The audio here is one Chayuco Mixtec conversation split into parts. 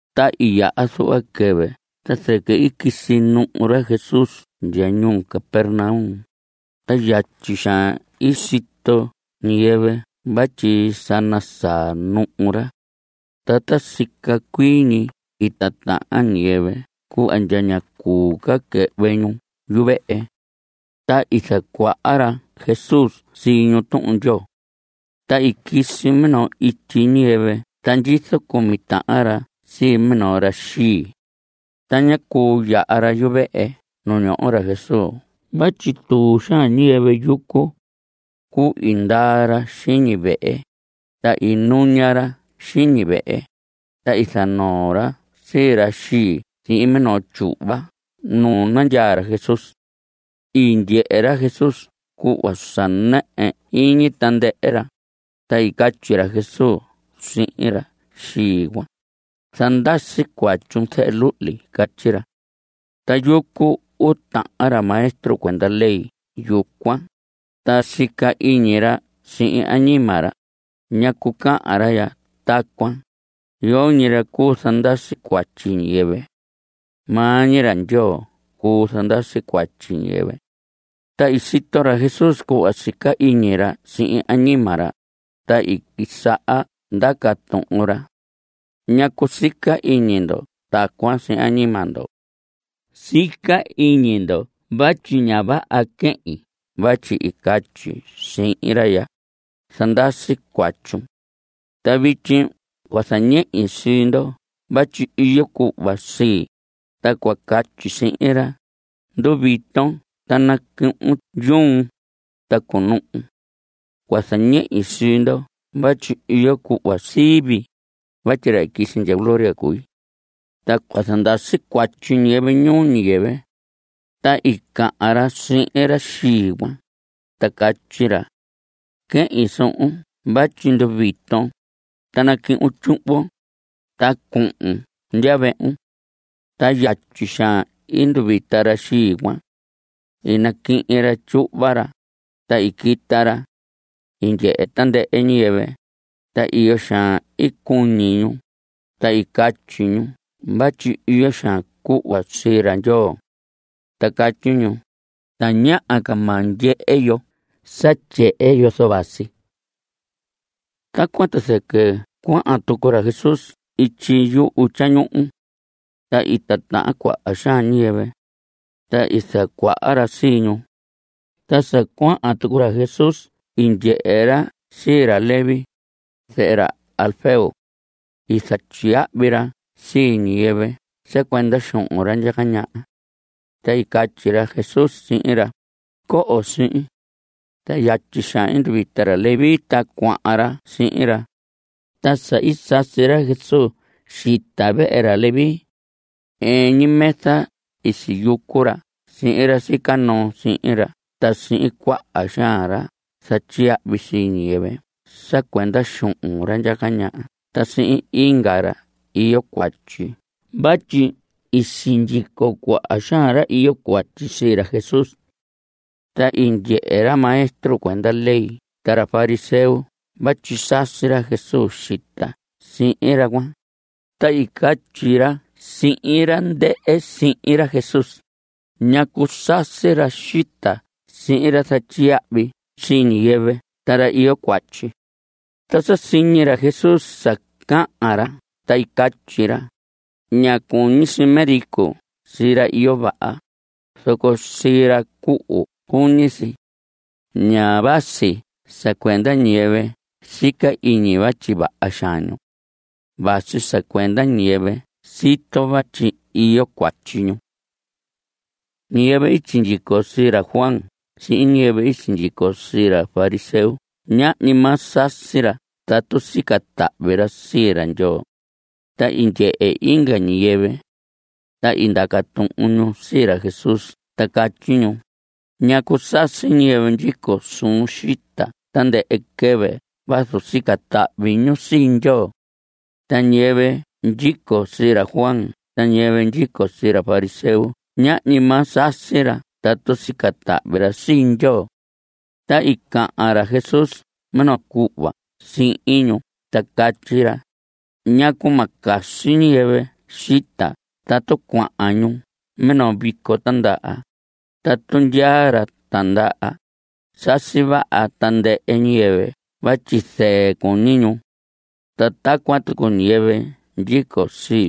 Ta i yaha zuhva quɨvɨ ta zɨquɨ i quisi nuhu ra Jesús ndya ñuu Capernaum, ta yatyi xaan i sito ñiyɨvɨ vatyi sa nasaa nuhu ra. Ta ta sica cuii ñi i titahan ñiyɨvɨ cuhva ndya ñá cuu ca quɨhvɨ ñu yuvehe. Ta i zacuaha ra Jesús sii ñu Tuhun Ndyoo. Ta i quisi minoo ityi ñiyɨvɨ ta ndyizo cumi tahan ra sii minoo ra xii. Ta ñá cuu yaha ra yuvehe nu ñoho ra Jesús vatyi tuu xaan ñiyɨvɨ yucu. Cuu, i ndaa ra xiñi vehe, ta i nuña ra xiñi vehe, ta i zanoo ra sii ra xii sihin minoo tyuhva nu nandyaa ra Jesús. I ndyehe ra Jesús cuhva sa nɨɨ iñi tandɨhɨ ra, ta i catyi ra Jesús sihin ra xii cuan: Zandasi cuatyun, zehe luhli. Catyi ra. Ta yucu uu tahan ra maestro cuenda ley yucuan, ta sica iñi ra sihin añima ra: “¿Ñacu cahan ra ya tacuan? Yoñi ra cuu zandasi cuatyi ñiyɨvɨ. Maa ñi ra Ndyoo cuu zandasi cuatyi ñiyɨvɨ.” Ta i sito ra Jesús cuhva sica iñi ra sihin añima ra, ta i quisaha ndaca tuhun ra: ¿Ñacu sica iñi ndo tacuan sihin añima ndo? Sica iñi ndo vatyi ña vaha quehin vatyi i catyi sihin ra ya: “Zandasi cuatyun.” Ta vityi cua zañehi sii ndo vatyi iyo cuhva sii, ta cua catyi sihin ra: “Nduviton ta nacuhun yuun, ta cunuhun.” Cua zañehi sii ndo vatyi iyo cuhva sii vii, vatyi ra i quisi ndya gloria cui. Ta cua zandasi cuatyi ñiyɨvɨ ñuu ñiyɨvɨ. Ta i cahan ra sihin ra xii cuan, ta catyi ra: Quehin suhun vatyi nduviton, ta nacuhun tyuhvon, ta cunuhun ndya vehun. Ta yatyi xaan i nduvita ra xii cuan. I naquihin ra tyuhva ra, ta i quita ra. I ndyehe tandɨhɨ ñiyɨvɨ, ta iyo xaan i cuñi ñu, ta i catyi ñu vatyi iyo xaan cuhva sii ra Ndyoo. Ta catyi ñu: Tañaha ca ma ndyehe yo sa tyehen yozo vasi si. Tacuan ta zɨquɨ cuahan tucu ra Jesús ityi yuhu tyañuhu. Ta i tatahan cuaha xaan ñiyɨvɨ. Ta i zacuaha ra sii ñu. Ta sa cuahan tucu ra Jesús i ndyehe ra sii ra Leví, zehe ra Alfeo. I zatyiyahvi ra sii ñiyɨvɨ sa cuenda xuhun ra ndyaca ñaha. Ta i catyi ra Jesús sihin ra: Coho sihin. Ta yatyi xaan i nduvita ra Leví, ta cuahan ra sihin ra. Ta sa i sasi ra Jesús xita vehe ra Leví, ɨɨn ñi mesa i siyucu ra sihin ra sica noo sihin ra ta sihin cuaha xaan ra zatyiyahvi sii ñiyɨvɨ sa cuenda xuhun ra ndyaca ñaha ta sihin inga ra iyo cuatyi vatyi i sindyico cuaha xaan ra iyo cuatyi sii ra Jesús. Ta i ndyehe ra maestro cuenda ley ta ra fariseo vatyi sasi ra Jesús xita sihin ra cuan, ta i catyi ra sihin ra ndɨhɨ sihin ra Jesús: ¿Ñacu sasi ra xita sihin ra zatyiyahvi sii ñiyɨvɨ ta ra iyo cuatyi? Ta sa siñi ra Jesús sa cahan ra ta i catyi ra: Ña cuñi si médico sii ra iyo vaha, zoco sii ra cuhu cuñi si. Ña vasi sa cuenda ñiyɨvɨ sica iñi vatyi vaha xaan ñu. Vasi sa cuenda ñiyɨvɨ sito vatyi iyo cuatyi ñu. Ñiyɨvɨ i sindyico sii ra Juan sihin ñiyɨvɨ i sindyico sii ra fariseo ñahñi maa sasi ra tatu sica tahvi ra sii ra Ndyoo. Ta i ndyehe inga ñiyɨvɨ. Ta i ndaca tuhun ñu sii ra Jesús ta catyi ñu: ¿Ñacu sasi ñiyɨvɨ ndyico suun xita tandɨhɨ quɨvɨ vazu sica tahvi ñu sii Ndyoo? Ta ñiyɨvɨ ndyico sii ra Juan ta ñiyɨvɨ ndyico sii ra fariseo ñahñi maa sasi ra tatu sica tahvi ra sii Ndyoo. Ta i cahan ra Jesús minoo cuhva sihin ñu ta catyi ra: ¿Ñacu ma casi ñiyɨvɨ xita tatu cuahan ñu minoo vico tindaha? Tatu ndyaa ra tindaha, sasi vaha tandɨhɨ ñiyɨvɨ vatyi zɨɨ cuñi ñu. Ta tacuan tucu ñiyɨvɨ ndyico sii.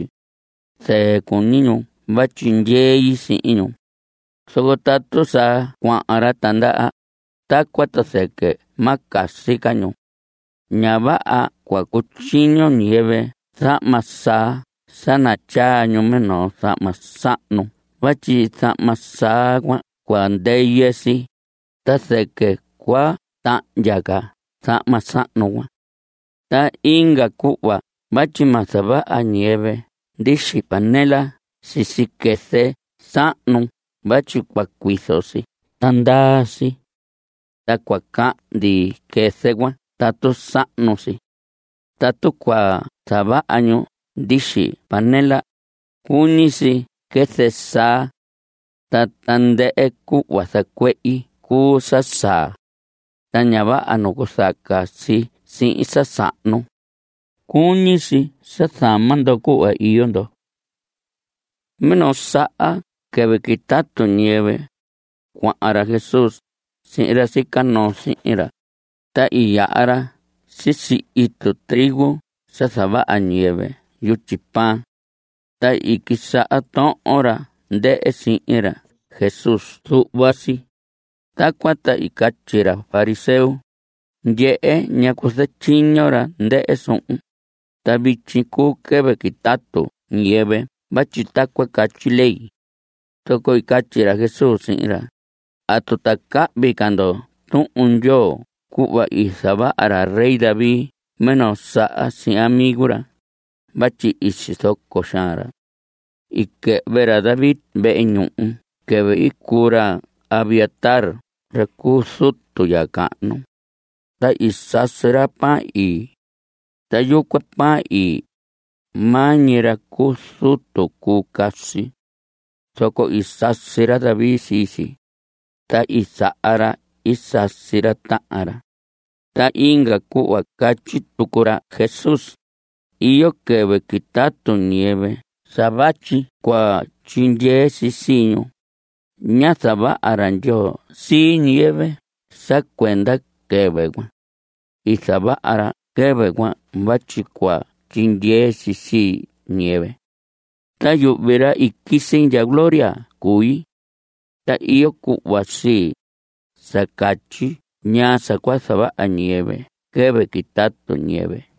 Zɨɨ cuñi ñu vatyi ndyei sihin ñu. Zoco tatu sa cuahan ra tindaha, tacuan ta zɨquɨ ma casi ca ñu. Ña vaha cua cutyiño ñiyɨvɨ zahma saa sa natyaa ñu minoo zahma sahnu vatyi zahma saa cuan cua ndɨyɨ si, ta zɨquɨ cua tahndya ca zahma sahnu cuan. Ta inga cuhva vatyi ma zavaha ñiyɨvɨ ndixi panela sisi quɨzɨ sahnu vatyi cua cuizo si ta ndaa si. Ta cua cahndi quɨzɨ cuan tatu sahnu si. Tatu cua zavaha ñu ndixi panela, cuñi si quɨzɨ saa. Ta tandɨhɨ cuhva zacuehi cuu sa saa. Ta ña vaha nacuzaca si sihin sa sahnu. Cuñi si sa zama ndo cuhva iyo ndo. Minoo saha quɨvɨ quitatu ñiyɨvɨ, cuahan ra Jesús sihin ra sica noo sihin ra, ta i yaha ra sisi itu trigo sa zavaha ñiyɨvɨ yutyi pan. Ta i quisaha tohon ra ndɨhɨ sihin ra Jesús zuhva si. Tacuan ta i catyi ra fariseo: Ndyehe, ¿ñacu zatyiño ra ndɨhɨ suhun? Ta vityi cuu quɨvɨ quitatu ñiyɨvɨ vatyi tacuan catyi ley. Zoco i catyi ra Jesús sihin ra: ¿Atu ta cahvi ca ndo Tuhun Ndyoo cuhva i zavaha ra rey David minoo saha sihin amigo ra? vatyi i sizoco xaan ra. I quɨhvɨ ra David vehe ñuhu quɨvɨ i cuu ra Abiatar ra cu zutu ya cahnu. Ta i sasi ra pan ii. Ta yucuan pan ii, maa ñi ra cu zutu cuu casi. Zoco i sasi ra David sii si. Ta i saha ra i sasi ra tahan ra. Ta inga cuhva catyi tucu ra Jesús: Iyo quɨvɨ quitatu ñiyɨvɨ sa vatyi cua tyindyee si sii ñu. Ñá zavaha ra Ndyoo sii ñiyɨvɨ sa cuenda quɨvɨ cuan. I zavaha ra quɨvɨ cuan vatyi cua tyindyee si sii ñiyɨvɨ. Ta yuhvi, ra i quisi ndya gloria cui. Ta iyo cuhva sii, sa catyi ñaa sa cua zavaha ñiyɨvɨ quɨvɨ quitatu ñiyɨvɨ.